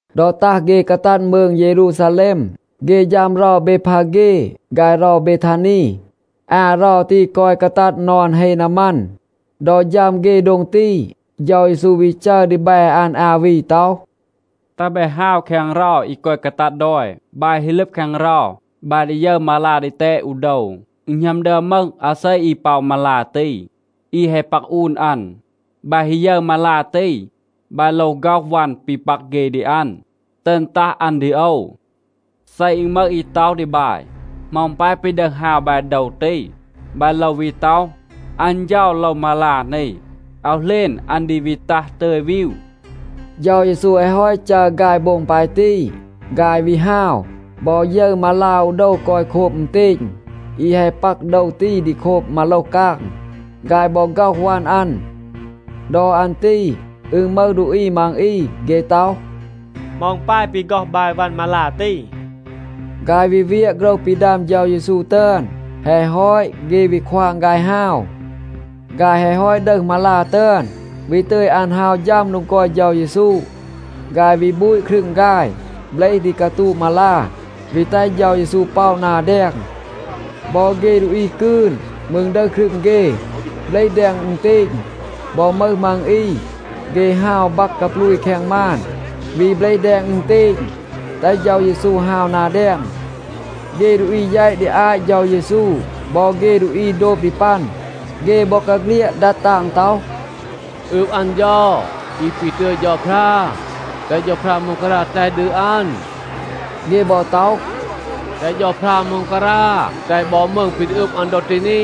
ดอ ตัห เฆ กาตัด มืง เยรูซาแลม, เฆ ฌัม เรา เบดพาเฆ ฆาย เรา เบทานี. อา เรา ตี กอย กาตัด นอน เฮ นามัน. ดอ ฌัม เฆ โดง ตี, เฌา เยซู วี จัร ดีแบ อัน อา วี ต็อห, “แตห บาย ฮาว แคง เรา อี กอย กาตัด ดอย. บาย ฮี ลึบ แคง เรา, บาย ดี ยึร มาลา ดีแตด อู โดว. อึณ หณัม ดึอม มึห อาเซ อี ป็อะ มาลา ตี. อี แฮะ ปัก อูน อัน. บาย ฮี ยึร มาลา ตี, บาย โลว ฆ็อห วัน ปี ปัก เฆ ดี อัน, ตึณ ตัห อัน ดี โอว. เซ อึณ มึห อี ต็อห ดี บาย, ‘เหมา อึณ ปาย ปี ดึห ฮาว บาย โดว ตี?’ บาย โลว วี ต็อห, ‘อัน เฌา โลว มาลา นี. อาว เหลณ, อัน ดี วี ตัห ตึย วีว.’” เฌา เยซู แฮะ ฮอต จัร ฆาย โบง ปาย ตี, ฆาย วี ฮาว, บอ ยึร มาลา อู โดว กอย โคบ อึณเตณ. อี แฮะ ปัก โดว ตี ดี โคบ มาโลห กาง. ฆาย บอ ฆ็อห วัน อัน. ดอ อัน ตี อึณ มึห ดูอี มัง อี, เฆ ต็อห, “เหมา อึณ ปาย ปี ฆ็อห บาย วัน มาลา ตี?” ฆาย วี เวียะ โฆรห ปี ดัม เฌา เยซู ตึอน. แฮะ ฮอต, เฆ วี ควาง ฆาย ฮาว. ฆาย แฮะ ฮอต ดึห มาลา ตึอน, วี ตึย อัน ฮาว ฌัม โดง กอย เฌา เยซู, ฆาย วี บูต ครึง ฆาย, เบลห ดี กาตูะ มาลา, วี แตห เฌา เยซู ป็อะ นา แดง. บอ เฆ ดูอี กืน มืร ดึห ครึง เฆ, เบลห แดง อึณเตณ. บอ มึห มัง อี, เฆ ฮาว บัก กาปลูย แคง มาน, วี เบลห แดง อึณเตณ, แตห เฌา เยซู ฮาว นา แดง. เฆ ดูอี แยต ดี อาต เฌา เยซู บอ เฆ ดูอี โดบ ดี ปัน, เฆ บอกาเฆลียด ดัด ตาง ต็อห, “อืบ อัน เฌา, อี ปี ตึย เฌาพรา. แตห เฌาพรา ม็องการา แตห ดี อัน.” เฆ บอ ต็อห, “แตห เฌาพรา ม็องการา แตห บอ มืง ปี ดี อึบ อัน ดอ ตี นี.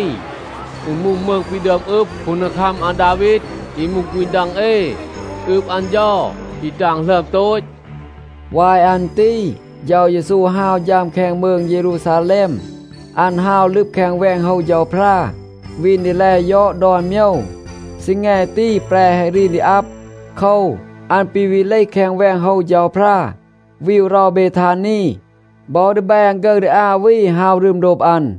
อึณ มูห มืง ปี ดึอม อึบ คูนดีคัม อาดาวีด, อี มูห ฆูณ ดัง เอ. อืบ อัน เฌา, อี ตาง หลึอม โตต.” วาย อัน ตี เฌา เยซู ฮาว ฌัม แคง มืง เยรูซาแลม. อัน ฮาว ลึบ แคง แวง โฮว เฌาพรา, วีน ดี แล ยอด ดอน โมยว. ซีแง ตี แปร แฮะ รีน ดี อับ. โคว, อัน ปี วี เลห แคง แวง โฮว เฌาพรา, วีว เรา เบทานี. บอ ดีแบ อัน ฆึร ดี อา วี ฮาว รึม โดบ อัน.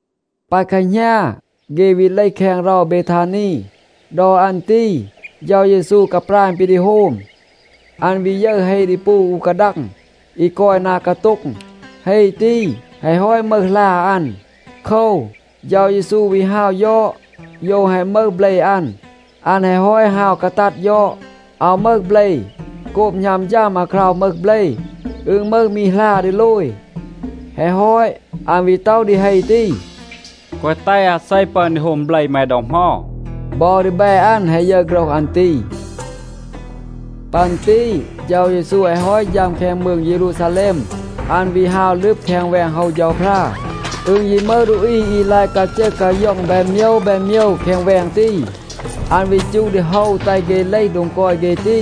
ปา แคหณา, เฆ วี เลห แคง เรา เบทานี. ดอ อัน ตี เฌา เยซู กาปราณ ปี ดี โฮม. อัน วี ยึร เฮ ดีปู อู กาดัง, อี กอย นา กาโต็ง. เฮ ตี แฮะ ฮอต มึห หลา อัน. โคว, เฌา เยซู วี ฮาว ยอด, โยว แฮะ มึห เบล อัน. อัน แฮะ ฮอต ฮาว กาตัด ยอด, อาว มึห เบล. โกบ หณัม ฌัม อาคราว มึห เบล, อึณ มึห มี หลา ดีโลย. แฮะ ฮอต, อัน วี ต็อห ดี เฮ ตี, “แกวะ แตห อาเซ ปึอน ดี โฮม เบล แม ดอ เหมา.” บอ ดีแบ อัน แฮะ ยึร โฆรห อัน ตี. ปัน ตี เฌา เยซู แฮะ ฮอต ฌัม แคง มืง เยรูซาแลม, อัน วี ฮาว ลึบ แคง แวง โฮว เฌาพรา. อึณ ยี มึห ดูอี อี ลาย กาจึห กาย็อง แบน โมยว แบน โมยว แคง แวง ตี. อัน วี จูห ดี โฮว แตห เฆ เลห โดง กอย เฆ ตี.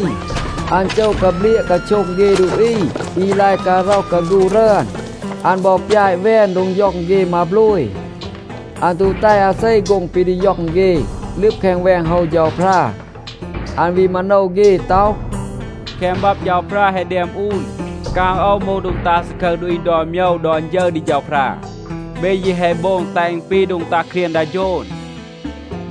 อัน โจะ กาเบลียะ กาโช็ง เฆ ดูอี อี ลาย การ็อห กาฆู รึอน. อัน บอ ปยาต แวน โดง ย็อง เฆ มาโบลย. อัน ตู แตห อาเซ โฆ็ง ปี ดี ย็อง เฆ, ลึบ แคง แวง โฮว เฌาพรา. อัน วี มาโนว เฆ ต็อห, “แคง บับ เฌาพรา แฮะ แดม อูน, ‘กาง โอว มูห โดง ตัห ซาคึร ดูอี ดอน โมยว ดอน ฌึร ดี เฌาพรา.’ เบ ยี แฮะ โบง แตห อึณ ปี โดง ตัห เครียง ดา โฌน.”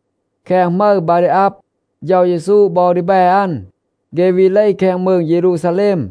แคง หมึร บา ดี อับ, เฌา เยซู บอ ดีแบ อัน, เฆ วี เลห แคง มืง เยรูซาแลม.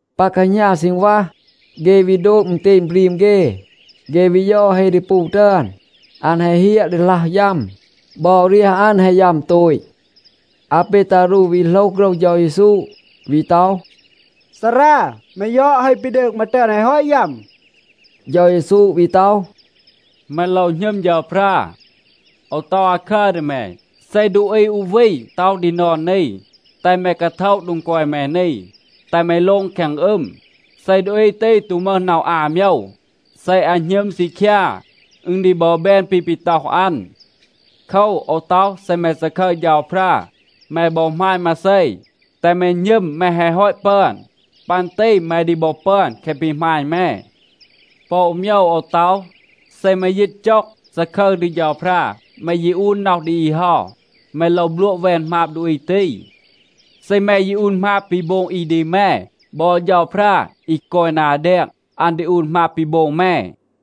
ปา แคหณา ซีณวัห, เฆ วี โดบ อึณเตณ บรีม เฆ. เฆ วี ยอด เฮ ดีปู ตึอน. อัน แฮะ เฮียะ ดีหลัห ยัม. บอ เรียห อัน แฮะ ยัม โตต. อาเปตารู วี โหลห โฆรห เฌา เยซู, วี ต็อห, “ซารา, แม ยอด, เฮ ปี ดืง แม ตึอน แฮะ ฮอต ยัม.” เฌา เยซู วี ต็อห, “แม โลว หณึม เฌาพรา. โอว ต็อห อาคัร ดี แม. เซ ดูอี อู วี ต็อห ดี นอน นี, ‘แตห แม กาโทะ โดง กอย แม นี, แตห แม โลง แคง อึม,’ เซ ดูอี ตี ตู มึห น็อห อา โมยว, เซ อัน หณึม ซีคยา, อึณ ดี บอ แบน ปี ปี ต็อห อัน. โคว, โอว ต็อห, เซ แม ซาคึร เฌาพรา, แม บอ หมาณ มาเซ, แตห แม หณึม แม แฮะ ฮอต ปึอน. ปัน ตี แม ดี บอ ปึอน แคะ ปี หมาณ แม. ปอ อู โมยว โอว ต็อห. เซ แม ยีต จ็อง, ซาคึร ดี เฌาพรา, แม ยี อูน น็อห ดี อี เฮา, แม โลว บลัวะ แวน หมาบ ดูอี ตี. เซ แม ยี อูน หมาบ ปี โบง อี ดี แม, บอ เฌาพรา, อี กอย นา แดง, อัน ดี อูน หมาบ ปี โบง แม.”a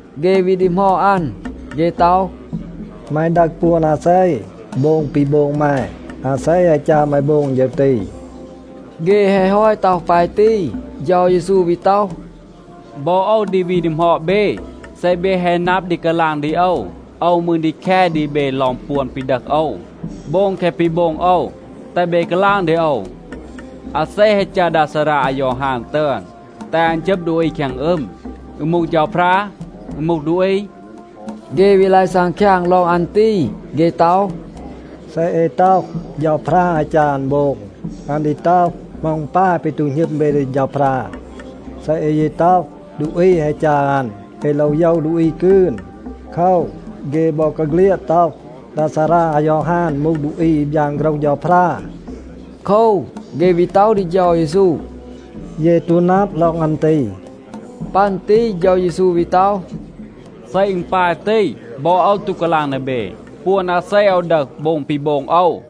เฆ วี ดีหมอด อัน. เฆ ต็อห, “แม ดึห ปวน อาเซ, โบง ปี โบง แม? อาเซ แฮะ จัร แม โบง ฌึร ตี?” เฆ แฮะ ฮอต ต็อห ปาย ตี, เฌา เยซู วี ต็อห, “บอ โอว ดี วี ดีหมอด เบ. เซ เบ แฮะ นับ ดี กาลาง ดี โอว, โอว มืร ดี แค ดี เบ ลอง ปวน ปี ดึห โอว, โบง แคะ ปี โบง โอว. แตห เบ กาลาง ดี โอว, อาเซ แฮะ จัร ดา ซารา อายอฮาน ตึอน, แตห อัน จึบ ดูอี แคง อึม? อึณ มูห เฌาพรา? อึณ มูห ดูอี?” เฆ วี ลาย ซังคยาง ลอง อัน ตี. เฆ ต็อห, “เซ เอ ต็อห, ‘เฌาพรา แฮะ จัร อัน โบง,’ อัน ดี ต็อห, ‘เหมา อึณ ปาย ปี ตู หณึม เบ ดี เฌาพรา?’ เซ เอ ยี ต็อห, ดูอี แฮะ จัร อัน, เอ โลว โยว ดูอี กืน. โคว, เฆ บอกาเฆลียด ต็อห, ดา ซารา อายอฮาน มูห ดูอี อี บยาน โฆรห เฌาพรา.” โคว, เฆ วี ต็อห ดี เฌา เยซู, “เย ตู นับ ลอง อัน ตี.” ปัน ตี เฌา เยซู วี ต็อห, “เซ อึณ ปาย ตี, บอ โอว ตู กาลาง ดี เบ, ปวน อาเซ โอว ดึห, โบง ปี โบง โอว.”